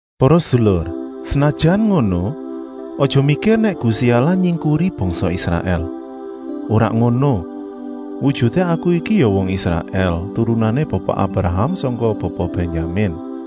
Para sedulur, senajan ngono, aja mikir nèk Gusti Allah nyingkuri bangsa Israèl. Ora ngono, wujuté aku iki ya wong Israèl, turunané Bapa Abraham sangka Bapa Bènyamin.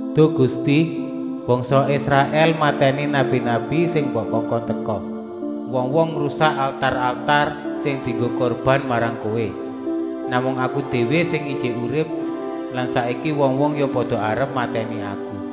“Duh Gusti, bangsa Israèl matèni nabi-nabi sing mbok kongkon teka. Wong-wong ngrusak altar-altar sing dienggo kurban marang Kowé. Namung aku déwé sing ijik urip lan saiki wong-wong ya pada arep matèni aku.”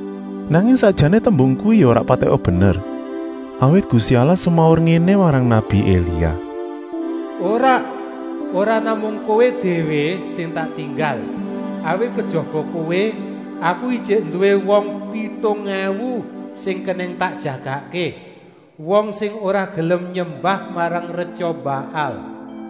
Nanging sakjané tembung kuwi ya ora patèka bener, awit Gusti Allah semaur ngéné marang nabi Elia: “Ora, ora namung kowé déwé sing ditinggal, awit kejaba kowé Aku ijik nduwé wong pitung èwu sing kenèng tak jagakké, wong sing ora gelem nyembah marang retya Baal.”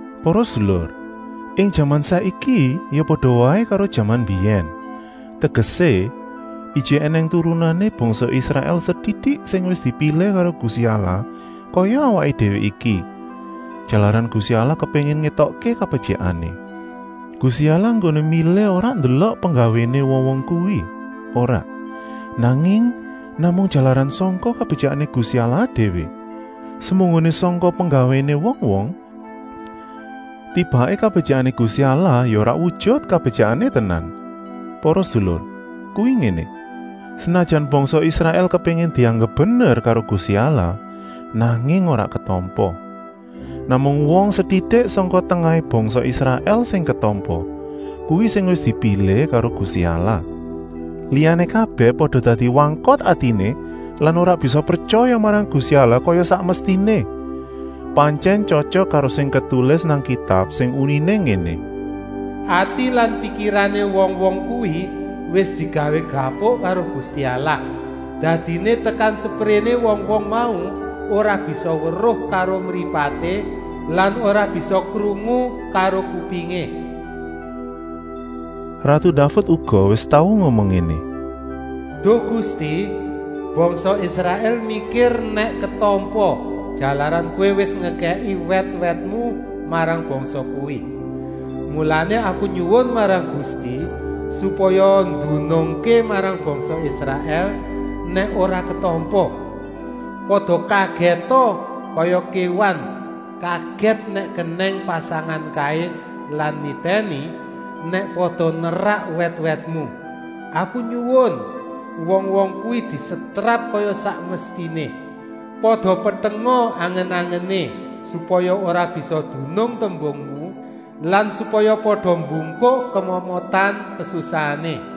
Para sedulur, ing jaman saiki ya pada waé karo jaman mbiyèn, tegesé, ijik ènèng turahané bangsa Israèl setitik sing wis dipilih karo Gusti Allah kaya awaké déwé iki, jalaran Gusti Allah kepéngin ngétokké kabetyikané. Gusti Allah enggoné milih ora ndelok penggawéné wong-wong kuwi, ora, nanging namung jalaran sangka kabetyikané Gusti Allah déwé. Semunggoné sangka penggawéné wong-wong, tibaké kabetyikané Gusti Allah ya ora wujut kabetyikané tenan. Para sedulur, kuwi ngéné: senajan bangsa Israèl kepéngin dianggep bener karo Gusti Allah, nanging ora ketampa. Namung wong setitik sangka tengahé bangsa Israèl sing ketampa, kuwi sing wis dipilih karo Gusti Allah. Liyané kabèh pada dadi wangkot atiné lan ora bisa pretyaya marang Gusti Allah kaya sak mestiné. Pantyèn tyotyok karo sing ketulis nang Kitab sing uniné ngéné: “Ati lan pikirané wong-wong kuwi wis digawé gabuk karo Gusti Allah, dadiné tekan sepréné wong-wong mau ora bisa weruh karo mripaté lan ora bisa krungu karo kupingé.” Ratu Daved uga wis tau ngomong ngéné: “Duh Gusti, bangsa Israèl mikir nèk ketampa, jalaran Kowé wis ngekèki wèt-wètmu marang bangsa kuwi. Mulané aku nyuwun marang Gusti, supaya ndunungké marang bangsa Israèl, nèk ora ketampa. Pada kagèta kaya kéwan kagèt nèk kenèng pasangan kaé lan nitèni, nèk pada nerak wèt-wètmu. Aku nyuwun, wong-wong kuwi disetrap kaya sak mestiné. Pada petenga angen-angené, supaya ora bisa dunung tembungmu lan supaya pada bungkuk kemomotan kasusahané.”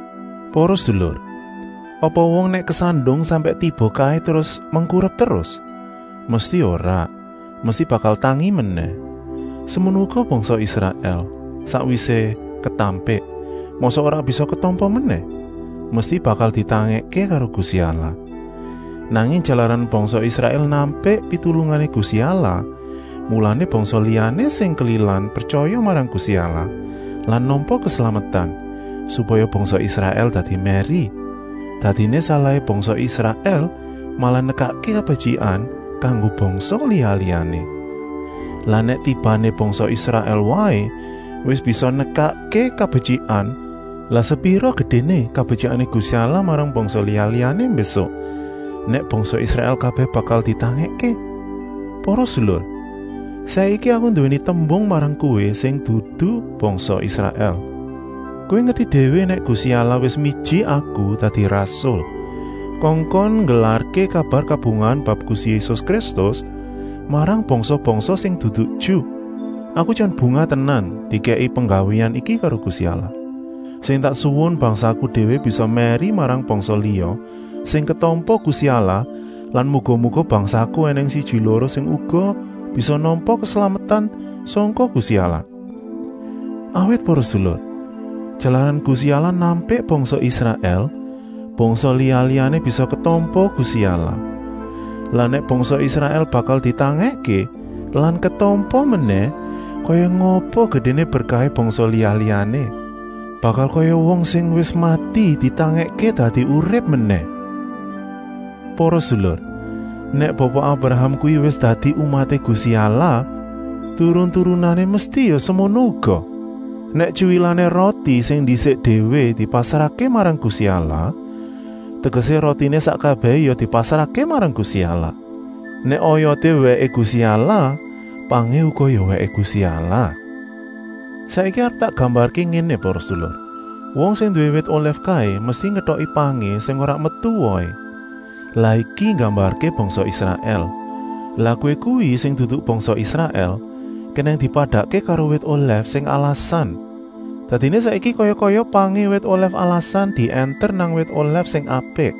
Para sedulur, apa wong nèk kesandung sampèk tiba kaé terus mengkurep terus? Mesti ora, mesti bakal tangi menèh. Semono uga bangsa Israèl, sakwisé ketampik, mosok ora bisa ketampa menèh? Mesti bakal ditangèkké karo Gusti Allah. Nanging jalaran bangsa Israèl nampik pitulungané Gusti Allah, mulané bangsa liyané sing kelilan pretyaya marang Gusti Allah lan nampa keslametan, supaya bangsa Israèl dadi mèri. Dadiné salahé bangsa Israèl malah nekakké kabetyikan kanggo bangsa liya-liyané. Lah nèk tibané bangsa Israèl waé wis bisa nekakké kabetyikan, lah sepira gedéné kabetyikané Gusti Allah marang bangsa liya-liyané mbésuk, nèk bangsa Israèl kabèh bakal ditangèkké? Para sedulur, saiki aku nduwèni tembung marang kowé sing dudu bangsa Israèl. Kowé ngerti déwé nèk Gusti Allah wis miji aku dadi rasul, kongkon nggelarké kabar kabungahan bab Gusti Yésus Kristus marang bangsa-bangsa sing dudu Ju. Aku jan bungah tenan dikèki penggawéan iki karo Gusti Allah. Sing tak suwun bangsaku déwé bisa mèri marang bangsa liya sing ketampa Gusti Allah lan muga-muga bangsaku ènèng siji-loro sing uga bisa nampa keslametan sangka Gusti Allah. Awit para sedulur, jalaran Gusti Allah nampik bangsa Israèl, bangsa liya-liyané bisa ketampa Gusti Allah. Lah nèk bangsa Israèl bakal ditangèkké lan ketampa menèh, kaya ngapa gedéné berkahé bangsa liya-liyané. Bakal kaya wong sing wis mati ditangèkké dadi urip menèh. Para sedulur, nèk Bapa Abraham kuwi wis dadi umaté Gusti Allah, turun-turunané mesti ya semono uga. Nèk tyuwilané roti sing ndisik déwé dipasrahké marang Gusti Allah, tegesé rotiné sak kabèhé ya dipasrahké marang Gusti Allah. Nèk oyoté wèké Gusti Allah, pangé uga ya wèké Gusti Allah. Saiki arep tak gambarké ngéné para sedulur. Wong sing nduwé wit olèf kaé mesti ngetoki pangé sing ora metu wohé. Lah iki nggambarké bangsa Israèl. Lah kowé kuwi sing dudu bangsa Israèl kenèng dipadakké karo wit olèf sing alasan. Dadiné saiki kaya-kaya pangé wit olèf alasan diènter nang wit olèf sing apik.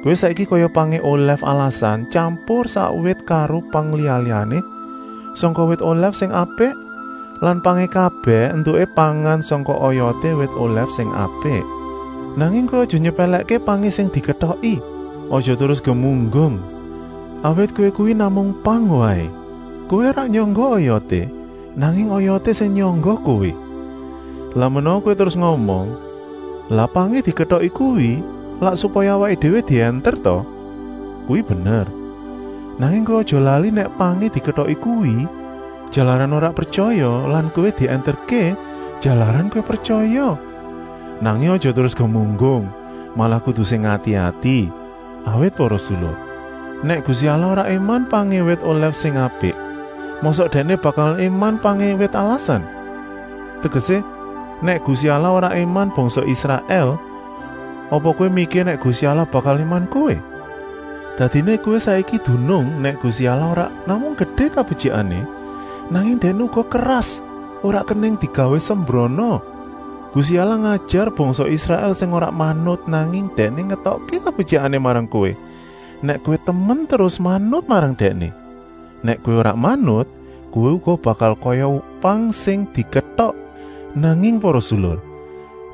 Kowé saiki kaya pangé olèf alasan tyampur sak wit karo pang liya-liyané sangka wit olèf sing apik lan pangé kabèh éntuké pangan sangka oyoté wit olèf sing apik. Nanging kowé aja nyepèlèkké pangé sing diketoki. Aja terus gemunggung, awit kowé kuwi namung pang waé. Kowé ora nyangga oyoté, nanging oyoté sing nyangga kowé. Lah menawa kowé terus ngomong: “Lah pangé diketoki kuwi lak supaya awaké déwé diènter ta?” Kuwi bener, nanging kowé aja lali nèk pangé diketoki kuwi, jalaran ora pretyaya lan kowé diènterké, jalaran kowé pretyaya. Nanging aja terus gemunggung, malah kudu sing ati-ati. Awit para sedulur, nèk Gusti Allah ora ngéman pangé wit olèf sing apik, mosok Dèkné bakal ngéman pangé wit alasan. Tegesé, nèk Gusti Allah ora ngéman bangsa Israèl, apa kowé mikir nèk Gusti Allah bakal ngéman kowé. Dadiné kowé saiki dunung nèk Gusti Allah ora namung gedé kabetyikané, nanging Dèkné uga keras, ora kenèng digawé sembrana. Gusti Allah ngajar bangsa Israèl sing ora manut, nanging Dèkné ngétokké kabetyikané marang kowé, nèk kowé temen terus manut marang Dèkné. Nèk kowé ora manut, kowé uga bakal kaya pang sing diketok. Nanging para sedulur,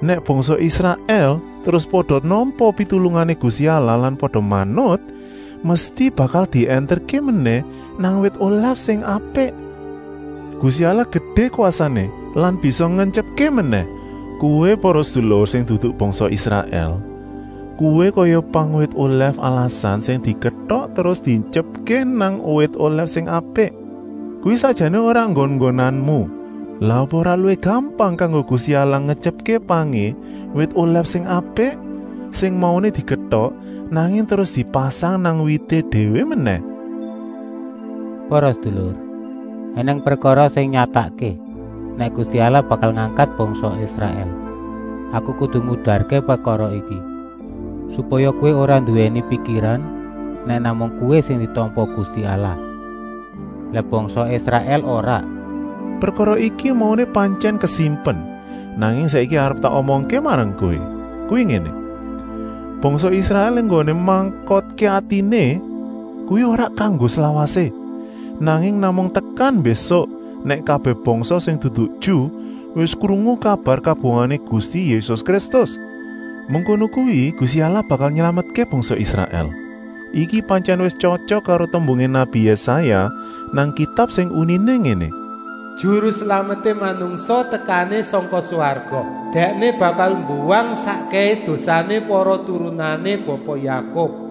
nèk bangsa Israèl terus pada nampa pitulungané Gusti Allah lan pada manut, mesti bakal diènterké menèh nang wit olèf sing apik. Gusti Allah gedé kwasané lan bisa ngentyepké menèh. Kowé para sedulur sing dudu bangsa Israèl, kowé kaya pangé wit olèf alasan sing diketok terus dientyepké nang wit olèf sing apik. Kuwi sakjané ora nggon-nggonanmu. Lah apa ora luwih gampang kanggo Gusti Allah ngentyepké pangé wit olèf sing apik, sing mauné diketok, nanging terus dipasang nang wité déwé menèh. Para sedulur, ènèng prekara liyané sing nyatakké, nèk Gusti Allah bakal ngangkat bangsa Israèl. Aku kudu ngudarké prekara iki, supaya kowé ora nduwèni pikiran nèk namung kowé sing ditampa Gusti Allah, lah bangsa Israèl ora. Prekara iki mauné pantyèn kasimpen, nanging saiki arep tak omongké marang kowé. Kuwi ngéné: bangsa Israèl enggoné mangkotké atiné kuwi ora kanggo slawasé, nanging namung tekan mbésuk, nèk kabèh bangsa sing dudu Ju wis krungu kabar kabungahané Gusti Yésus Kristus. Mengkono kuwi Gusti Allah bakal nylametké bangsa Israèl. Iki pantyèn wis tyotyok karo tembungé nabi Yésaya nang Kitab sing uniné ngéné: “Juru Slameté manungsa tekané sangka swarga, Dèkné bakal mbuwang sakkèhé dosané para turunané Bapa Yakub.”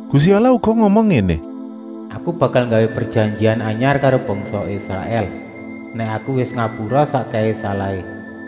Gusti Allah uga ngomong ngéné: “Aku bakal nggawé prejanjian anyar karo bangsa Israèl, nèk Aku wis ngapura sakkèhé salahé.”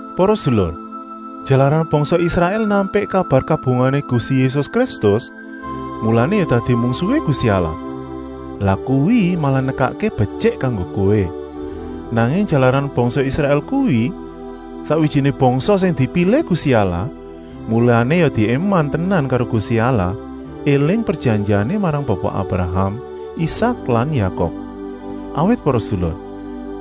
Para sedulur, jalaran bangsa Israèl nampik kabar kabungahané Gusti Yésus Kristus, mulané ya dadi mungsuhé Gusti Allah. Lah kuwi malah nekakké betyik kanggo kowé. Nanging jalaran bangsa Israèl kuwi sakwijiné bangsa sing dipilih Gusti Allah, mulané ya diéman tenan karo Gusti Allah, éling prejanjiané marang Bapa Abraham, Isak lan Yakub. Awit para sedulur,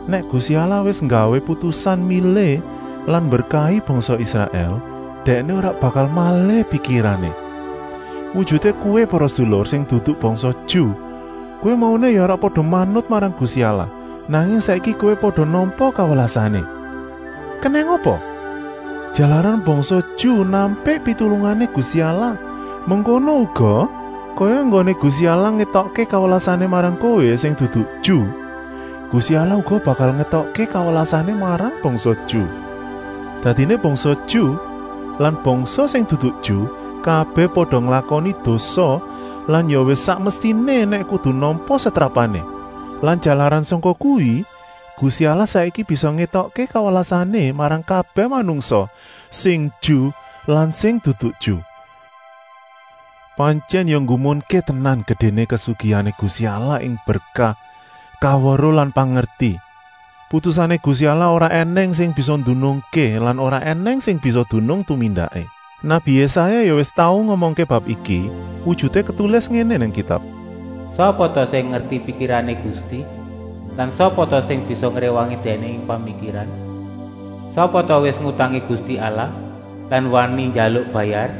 nèk Gusti Allah wis nggawé putusan milih lan mberkahi bangsa Israèl, Dèkné ora bakal malih pikirané. Wujuté kowé para sedulur sing dudu bangsa Ju, kowé mauné ya ora pada manut marang Gusti Allah, nanging saiki kowé pada nampa kawelasané. Kenèng apa? Jalaran bangsa Ju nampik pitulungané Gusti Allah. Mengkono uga, kaya enggoné Gusti Allah ngétokké kawelasané marang kowé sing dudu Ju, Gusti Allah uga bakal ngétokké kawelasané marang bangsa Ju. Dadiné bangsa Ju lan bangsa sing dudu Ju kabèh wis pada nglakoni dosa lan ya wis sak mestiné nèk kudu nampa setrapané. Lan jalaran sangka kuwi, Gusti Allah saiki bisa ngétokké kawelasané marang kabèh manungsa, sing Ju lan sing dudu Ju. Pantyèn ya nggumunké tenan gedéné kasugihané Gusti Allah ing berkah, kaweruh lan pangerti. Putusané Gusti Allah ora ènèng sing bisa ndunungké lan ora ènèng sing bisa dunung tumindaké. Nabi Yésaya ya wis tau ngomongké bab iki, wujuté ketulis ngéné nang Kitab: “Sapa ta sing ngerti pikirané Gusti lan sapa ta sing bisa ngréwangi Dèkné ing pamikiran. Sapa ta wis ngutangi Gusti Allah lan wani njaluk bayar!”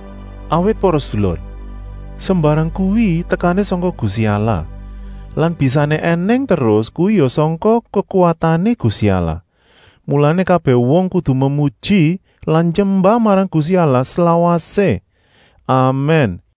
Awit para sedulur, sembarang kuwi tekané sangka Gusti Allah lan bisané ènèng terus kuwi ya sangka kekuwatané Gusti Allah, mulané kabèh wong kudu memuji lan nyembah marang Gusti Allah slawasé. Amèn.